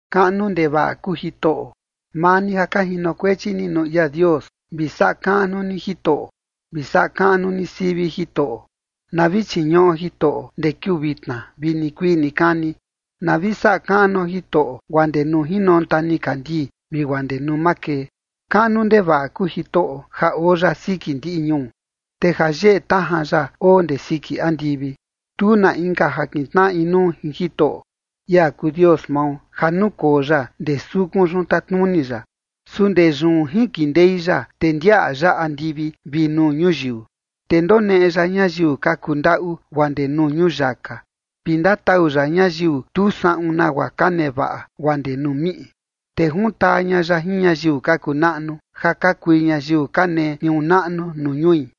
¡Kaꞌnu ndevaꞌa kuu Jitoꞌo! Maa ni ja ka jinokuechi ni nuu ia Dios, vi saꞌa kaꞌnu ni Jitoꞌo, vi saꞌa kaꞌnu ni sivi Jitoꞌo. Na vi chiñuꞌo Jitoꞌo, ndee kiuu vitna vi nikuii nikani. Na vi saꞌa kaꞌnuo Jitoꞌo, guaa ndee nuu jinonta nikandii vi guaa ndee nuu makee. Kaꞌnu ndevaꞌa kuu Jitoꞌo ja oo ya siki ndiꞌi ñuu, te ja yeꞌe tajan ya oo ndee siki andivi. Tu na inka ja kintnaꞌa inuu jin Jitoꞌo, ia kuu Dios mao, ja nukoo ya ndee sukun yun tatnuni ya. Su ndee yun jinkindei ya, te ndiaꞌa ya andivi vi nuu ñuyiu. Te ndoneꞌe ya ñayiu ka kuu ndaꞌu guaa ndee nuu ñuyaka, vi ndatau ya ñayiu tu saꞌun nagua ka nevaꞌa guaa ndee nuu miꞌi. Te juntaa ña ya jin ñayiu ka kuu naꞌnu, ja ka kui ñayiu ka nee tniuu naꞌnu nuu ñui.